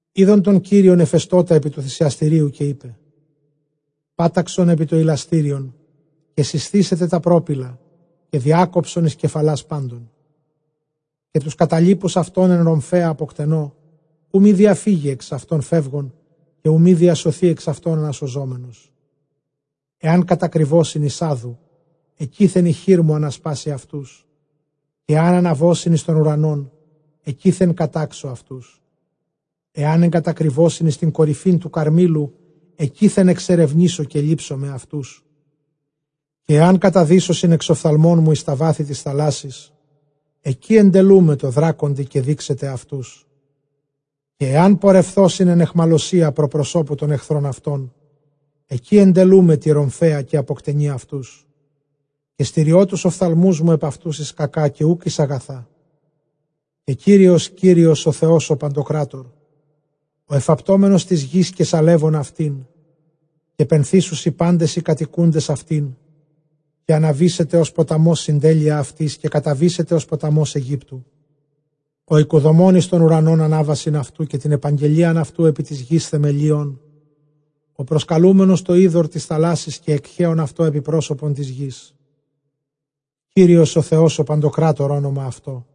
Εἶδον τὸν Κύριον ἐφεστῶτα ἐπὶ τοῦ θυσιαστηρίου, καὶ εἶπε, Πάταξον ἐπὶ τὸ ἱλαστήριον, καὶ σεισθήσεται τὰ πρόπυλα, καὶ διάκοψον εἰς κεφαλὰς πάντων· καὶ τοὺς καταλοίπους αὐτῶν ἐν ῥομφαίᾳ ἀποκτενῶ, οὐ μὴ διαφύγῃ ἐξ αὐτῶν φεύγων, καὶ οὐ μὴ διασωθῇ ἐξ αὐτῶν ἀνασωζόμενος. Ἐὰν κατακρυβῶσιν εἰς ᾅδου, ἐκεῖθεν ἡ χείρ μου ἀνασπάσει αὐτούς· καὶ ἐὰν ἀναβῶσιν εἰς τὸν οὐρανὸν, ἐκεῖθεν κατάξω αὐτούς. Ἐὰν ἐγκατακρυβῶσιν εἰς τὴν κορυφὴν τοῦ Καρμήλου, ἐκεῖθεν ἐξερευνήσω, καὶ λήψομαι αὐτούς· καὶ ἐὰν καταδύσωσιν ἐξ ὀφθαλμῶν μου εἰς τὰ βάθη τῆς θαλάσσης, ἐκεῖ ἐντελοῦμαι τῷ δράκοντι, καὶ δήξεται αὐτούς. Καὶ ἐὰν πορευθῶσιν ἐν αἰχμαλωσίᾳ πρὸ προσώπου τῶν ἐχθρῶν αὐτῶν, ἐκεῖ ἐντελοῦμαι τῇ ῥομφαίᾳ, καὶ ἀποκτενεῖ αὐτούς· καὶ στηριῶ τοὺς ὀφθαλμούς μου ἐπʼ αὐτοὺς εἰς κακὰ, καὶ οὐκ εἰς ἀγαθά. Καὶ Κύριος Κύριος ὁ Θεὸς ὁ παντοκράτωρ, ὁ ἐφαπτόμενος τῆς γῆς, καὶ σαλεύων αὐτὴν, καὶ πενθήσουσι πάντες οἱ κατοικοῦντες αὐτὴν, καὶ ἀναβήσεται ὡς ποταμὸς συντέλεια αὐτῆς, καὶ καταβήσεται ὡς ποταμὸς Αἰγύπτου· Ὁ οἰκοδομῶν εἰς τὸν οὐρανὸν ἀνάβασιν αὐτοῦ, καὶ τὴν ἐπαγγελίαν αὐτοῦ ἐπὶ τῆς γῆς θεμελιῶν, ὁ προσκαλούμενος τὸ ὕδωρ τῆς θαλάσσης, καὶ ἐκχέων αὐτὸ ἐπὶ πρόσωπον τῆς γῆς· Κύριος παντοκράτωρ ὄνομα αὐτῷ.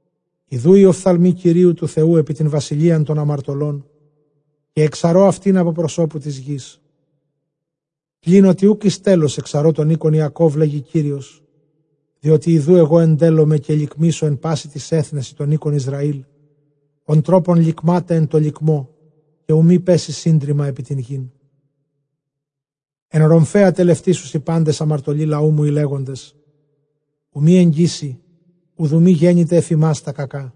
Ἰδοὺ οἱ ὀφθαλμοὶ Κυρίου τοῦ Θεοῦ ἐπὶ τὴν βασιλείαν τῶν ἁμαρτωλῶν, καὶ ἐξαρῶ αὐτὴν ἀπὸ προσώπου τῆς γῆς· πλὴν ὅτι οὐκ εἰς τέλος ἐξαρῶ τὸν οἶκον Ἰακὼβ, λέγει Κύριος. Διότι ἐγὼ ἐντέλλομαι, καὶ λικμήσω ἐν πᾶσι τοῖς ἔθνεσι τὸν οἶκον Ἰσραὴλ, ὃν τρόπον λικμᾶται ἐν τῷ λικμῷ, καὶ οὐ μὴ πέσῃ σύντριμμα ἐπὶ τὴν γῆν. Ἐν ῥομφαίᾳ τελευτήσουσι πάντες ἁμαρτωλοὶ λαοῦ μου, οἱ λέγοντες, οὐ μὴ ἐγγίσῃ, οὐδὲ μὴ γένηται ἐφʼ ἡμᾶς τὰ κακά.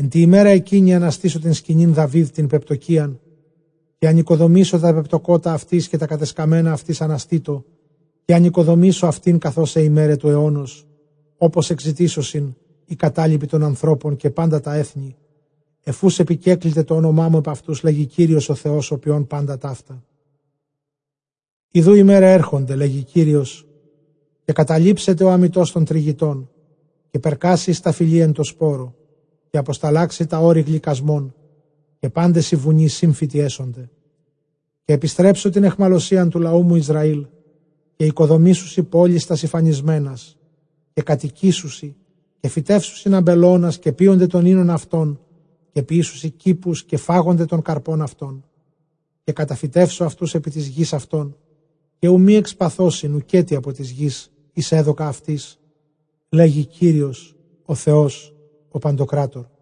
Ἐν τῇ ἡμέρᾳ ἐκείνῃ ἀναστήσω τὴν σκηνὴν Δαυὶδ τὴν πεπτωκυῖαν, καὶ ἀνοικοδομήσω τὰ πεπτωκότα αὐτῆς, καὶ τὰ κατεσκαμμένα αὐτῆς ἀναστήσω, καὶ ἀνοικοδομήσω αὐτὴν καθὼς αἱ ἡμέραι τοῦ αἰῶνος. Ὅπως ἐκζητήσωσιν οἱ κατάλοιποι τῶν ἀνθρώπων καὶ πάντα τὰ ἔθνη, ἐφʼ οὓς ἐπικέκληται τὸ ὄνομά μου ἐπʼ αὐτοὺς, λέγει Κύριος ὁ ποιῶν πάντα ταῦτα. Ἰδοὺ ἡμέραι ἔρχονται, λέγει Κύριος, καὶ καταλήψεται ὁ ἀμητὸς τὸν τρυγητὸν, καὶ περκάσει ἡ σταφυλὴ ἐν τῷ σπόρῳ, καὶ ἀποσταλάξει τὰ ὄρη γλυκασμὸν, καὶ πάντες οἱ βουνοὶ σύμφυτοι ἔσονται. Καὶ ἐπιστρέψω τὴν αἰχμαλωσίαν τοῦ λαοῦ μου Ἰσραὴλ, καὶ οἰκοδομήσουσι πόλεις τὰς ἠφανισμένας, καὶ κατοικήσουσι, καὶ φυτεύσουσιν ἀμπελῶνας, καὶ πίονται τὸν οἶνον αὐτῶν, καὶ ποιήσουσι κήπους, καὶ φάγονται τὸν καρπὸν αὐτῶν· Καὶ καταφυτεύσω αὐτοὺς ἐπὶ τῆς γῆς αὐτῶν, καὶ οὐ μὴ ἐκσπασθῶσιν οὐκέτι ἀπὸ τῆς γῆς, ἧς ἔδωκα αὐτοῖς, λέγει Κύριος ὁ Θεὸς παντοκράτωρ.